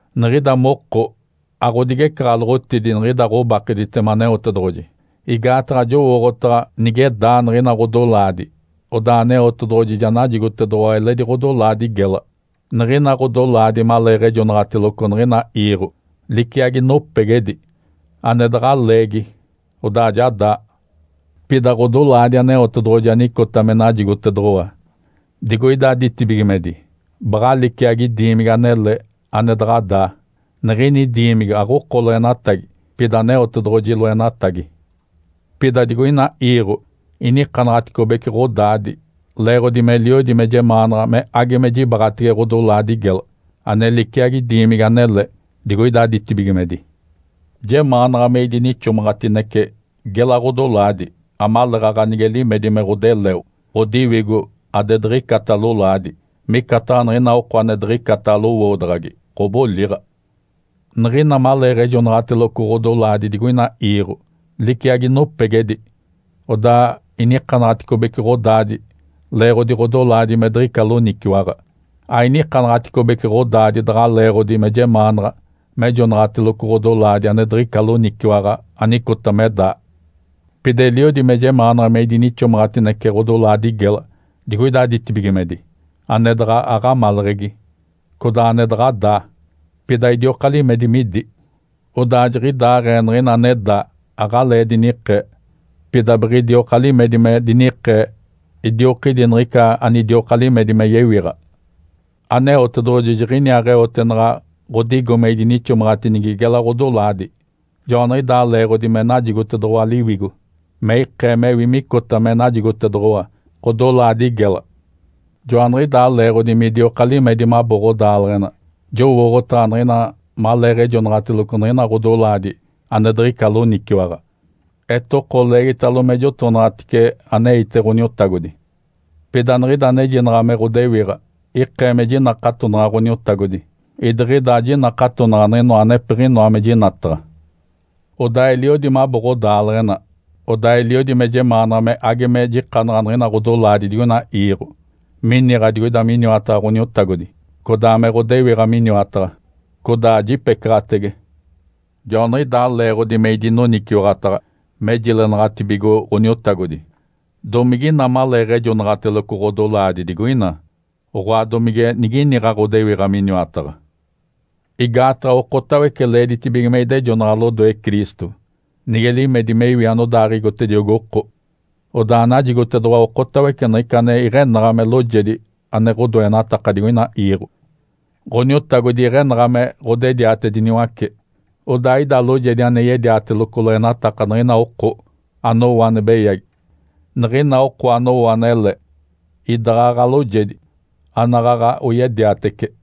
Niɡ̶ida moko aɡ̶odigecaɡ̶aloɡ̶otidi niɡ̶ida ɡ̶obakegitema Aneotedoɡ̶oji, igaataɡ̶a jowooɡ̶otaɡ̶a nige daa niɡ̶ina ɡ̶odolaadi, odaa Aneotedoɡ̶oji ja najigotedoɡ̶owa eledi ɡ̶odolaadi gela. Niɡ̶ina ɡ̶odolaadi maleeɡ̶ejonaɡ̶ateloco niɡ̶ina iiɡ̶o liciagi nopegedi ane daɡ̶a leegi odaa ja daa. Pida ɡ̶odolaadi Aneotedoɡ̶oji anicota me najigotedoɡ̶owa digoida ditibigimedi baɡ̶a liciagi diimigi anele ane daɡ̶a daa. Niɡ̶ini diimigi aɡ̶oko loenatagi, pida Aneotedoɡ̶oji loenatagi. Pida digoina iiɡ̶o inikanaɡ̶aticobece ɡ̶odaadi leeɡ̶odi meliodi me jemaanaɡ̶a me age me jibaɡ̶atege ɡ̶odolaadi gela ane liciagi diimigi anele digoida ditibigimedi. Jemaanaɡ̶a me idinixomaɡ̶atinece gela ɡ̶odolaadi, amaleeɡ̶aɡ̶a nige limedi me ɡ̶odeleo, ɡ̶odiwigo adediɡ̶icata lolaadi, micataɡ̶a niɡ̶ina oko ane diɡ̶icata lowoodaɡ̶agi ɡ̶oboliɡ̶a. Niɡ̶ina maleeɡ̶ejonaɡ̶ateloco ɡ̶odolaadi digoina iiɡ̶o, liciagi nopegedi, odaa inikanaɡ̶aticobece ɡ̶odaadi leeɡ̶odi ɡ̶odolaadi me diɡ̶ica loniciwaɡ̶a. Ainikanaɡ̶aticobece ɡ̶odaadi daɡ̶a leeɡ̶odi me jemaanaɡ̶a mejonaɡ̶ateloco ɡ̶odolaadi ane diɡ̶ica loniciwaɡ̶a anicota me daa. Pida eliodi me jemaanaɡ̶a me idinixomaɡ̶atinece ɡ̶odolaadi gela digoida ditibigimedi, ane daɡ̶a aɡ̶amaleɡ̶egi, codaa ane daɡ̶a daa, pida idioka limedi midi. Odaa jiɡ̶idaaɡ̶ee niɡ̶ina ane daa aɡ̶alee dinikee, pida biɡ̶idioka limedi me dinikee idiokidi niɡ̶ica anidioka limedi me yewiɡ̶a. Aneotedoɡ̶oji jiɡ̶iniaaɡ̶eote naɡ̶a ɡ̶odigo me idinixomaɡ̶atinigi gela ɡ̶odolaadi. Joaniɡ̶idaa leeɡ̶odi me najigotedoɡ̶owa Liwigo me ikee mewi micota me najigotedoɡ̶owa ɡ̶odolaadi gela. Joaniɡ̶idaa leeɡ̶odi midioka limedi mabo ɡ̶odaaleɡ̶ena. Jowooɡ̶otaɡ̶a niɡ̶ina maleeɡ̶ejonaɡ̶ateloco niɡ̶ina ɡ̶odolaadi ane diɡ̶ica loniciwaɡ̶a, etoko leegitalo me jotonaɡ̶atice aneite Ǥoniotagodi. Pida niɡ̶ida anejinaɡ̶a me ɡ̶odewiɡ̶a ikee me jinakatonaɡ̶a Ǥoniotagodi, idiɡ̶ida ajinakatonaɡ̶a niɡ̶inoa anepiɡ̶inoa me jinataɡ̶a. Odaa eliodi mabo ɡ̶odaaleɡ̶ena. Odaa eliodi me jemaanaɡ̶a me age me jikanaɡ̶a niɡ̶ina ɡ̶odolaadi digoina iiɡ̶o, miniɡ̶a digoida miniwataɡ̶a Ǥoniotagodi, codaa me ɡ̶odewiɡ̶a miniwataɡ̶a, codaa jipecaɡ̶atege. Joaniɡ̶idaa leeɡ̶odi me idinoniciwaɡ̶ataɡ̶a me jilenaɡ̶atibigo Ǥoniotagodi, domigina maleeɡ̶ejonaɡ̶ateloco ɡ̶odolaadi digoina, oɡ̶oa, domige niginiɡ̶a ɡ̶odewiɡ̶a miniwataɡ̶a. Igaataɡ̶a okotawece leeditibige me idejonaɡ̶a lodoe Cristo, nige limedi me iwi anodaaɡ̶igotediogi oko. Odaa najigotedoɡ̶owa okotawece niɡ̶ica ane iɡ̶enaɡ̶a me loojedi ane ɡ̶odoenataka digoina iiɡ̶o. Ǥoniotagodi iɡ̶enaɡ̶a me ɡ̶odediatediniwace. Odaa ida loojedi ane yediateloco loenataka niɡ̶ina oko anowo ane beyagi, niɡ̶ina oko anowo anele idaɡ̶aɡ̶a loojedi anaɡ̶aɡ̶a oyediatece.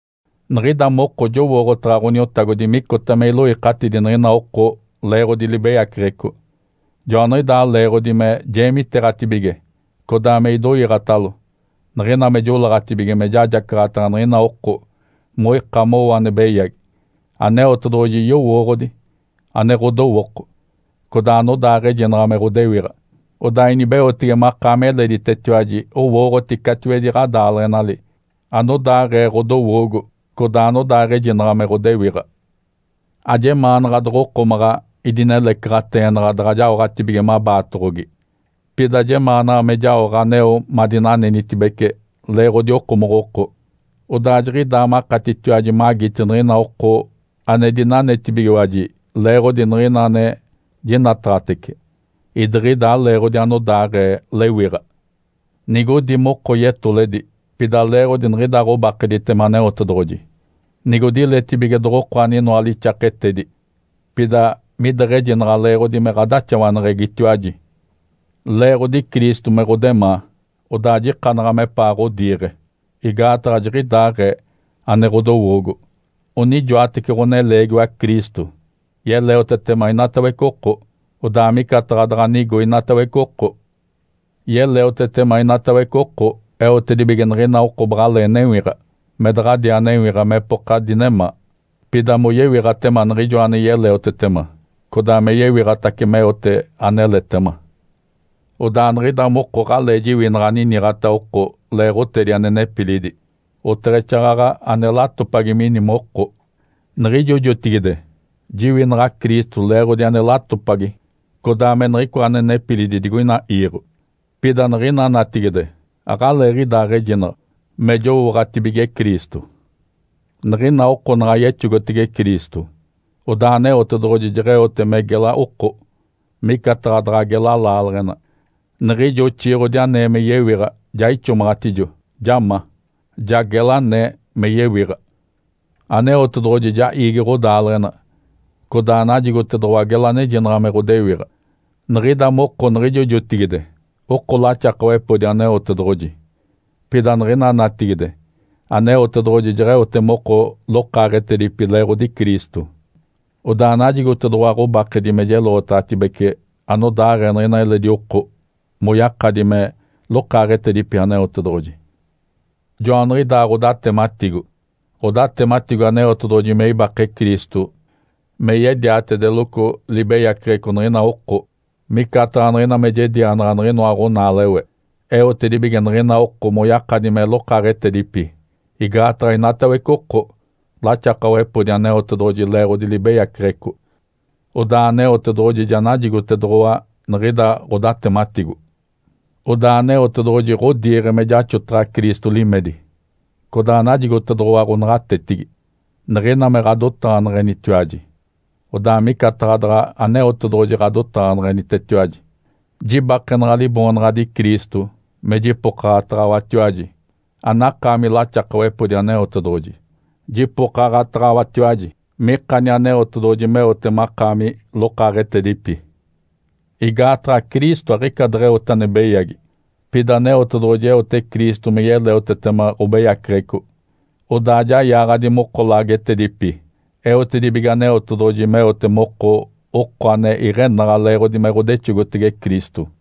Niɡ̶ida moko jowooɡ̶otaɡ̶a Ǥoniotagodi micota me iloikatidi niɡ̶ina oko leeɡ̶odi libeyaceɡ̶eco. Joaniɡ̶idaa leeɡ̶odi me jeemiteeɡ̶atibige codaa me idoiiɡ̶atalo niɡ̶ina me joleeɡ̶atibige me jajacaɡ̶ataɡ̶a niɡ̶ina oko moika mowo ane beyagi. Aneotedoɡ̶oji yowooɡ̶odi ane ɡ̶odowooko, codaa anodaaɡ̶ejinaɡ̶a me ɡ̶odewiɡ̶a. Odaa inibeotege makaami eleditetiwaji owooɡ̶oti catiwedi ɡ̶adaaleɡ̶enali anodaaɡ̶ee ɡ̶odowoogo codaa anodaaɡ̶ejinaɡ̶a me ɡ̶odewiɡ̶a. Ajemaanaɡ̶a doɡ̶okomaɡ̶a idinelecaɡ̶ateenaɡ̶a daɡ̶a jaoɡ̶atibige mabaatacoɡ̶ogi. Pida jemaanaɡ̶a me jaoɡ̶a aneo madinanenitibece leeɡ̶odi okomoɡ̶oko. Odaa jiɡ̶idaa makatitiwaji magiti niɡ̶ina oko ane dinanetibigiwaji leeɡ̶odi niɡ̶ina ane jinataɡ̶atece, idiɡ̶ida aleeɡ̶odi anodaaɡ̶ee lewiɡ̶a. Nigodi moko yetoledi, pida leeɡ̶odi niɡ̶ida ɡ̶obakegitema Aneotedoɡ̶oji. Nigodiletibige doɡ̶oko aninoa lixaketedi, pida mideɡ̶ejinaɡ̶a leeɡ̶odi me ɡ̶adaxawaneɡ̶egitiwaji. Leeɡ̶odi Cristo me ɡ̶odemaa, odaa jikanaɡ̶a mepaa ɡ̶odiiɡ̶e. Igaataɡ̶a jiɡ̶idaaɡ̶ee ane ɡ̶odowoogo. Onijoatece ɡ̶oneleegiwa Cristo yeleotetema inatawece oko, odaa micataɡ̶a daɡ̶a nigo inatawece oko. Yeleotetema inatawece oko eotedibige niɡ̶ina oko baɡ̶alee newiɡ̶a, me daɡ̶adiaa newiɡ̶a mepoka dinemaa, pida moyewiɡ̶atema Niɡ̶ijoa ane yeleotetema, codaa me yewiɡ̶atace meote aneletema. Odaa niɡ̶ida moko aɡ̶alee jiwinaɡ̶a aniniɡ̶ata oko leeɡ̶otedi ane nepilidi, oteɡ̶exaaɡ̶aɡ̶a ane latopagi mini moko. Niɡ̶ijo jotigide jiwinaɡ̶a Cristo leeɡ̶odi ane latopagi codaa me niɡ̶icoa ane nepilidi digoina iiɡ̶o. Pida niɡ̶ina natigide aɡ̶aleeɡ̶idaaɡ̶ejinaɡ̶a me jowooɡ̶atibige Cristo. Niɡ̶ina oko naɡ̶a yexogotege Cristo, odaa Aneotedoɡ̶oji jeɡ̶eote me gela oko, micataɡ̶a daɡ̶a gela laaleɡ̶ena. Niɡ̶ijo oxiiɡ̶odi anee me yewiɡ̶a ja ixomaɡ̶atijo, ja ma. Ja gela anee me yewiɡ̶a. Aneotedoɡ̶oji ja iigi ɡ̶odaaleɡ̶ena, codaa najigotedoɡ̶owa gela anejinaɡ̶a me ɡ̶odewiɡ̶a. Niɡ̶ida moko niɡ̶ijo jotigide oko laxakawepodi Aneotedoɡ̶oji, pida niɡ̶ina natigide Aneotedoɡ̶oji jeɡ̶eote moko lokaaɡ̶etedipi leeɡ̶odi Cristo. Odaa najigotedoɡ̶owa ɡ̶obakedi me jeloɡ̶otaɡ̶atibece anodaaɡ̶ee niɡ̶ina eledi oko moyakadi me lokaaɡ̶etedipi Aneotedoɡ̶oji. Joaniɡ̶idaa ɡ̶odatematigo. Ǥodatematigo Aneotedoɡ̶oji me ibake Cristo me yediatedeloco libeyaceɡ̶eco niɡ̶ina oko, micataɡ̶a niɡ̶ina me jedianaɡ̶a niɡ̶inoa ɡ̶onaalewe. Eotedibige niɡ̶ina oko moyakadi me lokaaɡ̶etedipi, igaataɡ̶a inatawece oko laxakawepodi Aneotedoɡ̶oji leeɡ̶odi libeyaceɡ̶eco. Odaa Aneotedoɡ̶oji ja najigotedoɡ̶owa niɡ̶ida ɡ̶odatematigo. Odaa Aneotedoɡ̶oji ɡ̶odiiɡ̶e me jaxotaɡ̶a Cristo limedi, codaa najigotedoɡ̶owa ɡ̶onaɡ̶atetigi. Niɡ̶ina me ɡ̶adotaɡ̶aneɡ̶enitiwaji, odaa micataɡ̶a daɡ̶a Aneotedoɡ̶oji ɡ̶adotaɡ̶aneɡ̶enitetiwaji. Jibakenaɡ̶a Liboonaɡ̶adi Cristo me jipokaɡ̶ataɡ̶awatiwaji anakaami laxakawepodi Aneotedoɡ̶oji, jipokaɡ̶ataɡ̶awatiwaji mikani Aneotedoɡ̶oji meote makaami lokaaɡ̶etedipi. Igaataɡ̶a Cristo aɡ̶ica deɡ̶eote ane beyagi. Pida Aneotedoɡ̶oji eote Cristo me yeleotetema ɡ̶obeyaceɡ̶eco, odaa ja yaaɡ̶adi moko laagetedipi, eotedibige Aneotedoɡ̶oji meote moko oko ane iɡ̶enaɡ̶a leeɡ̶odi me ɡ̶odexogotege Cristo.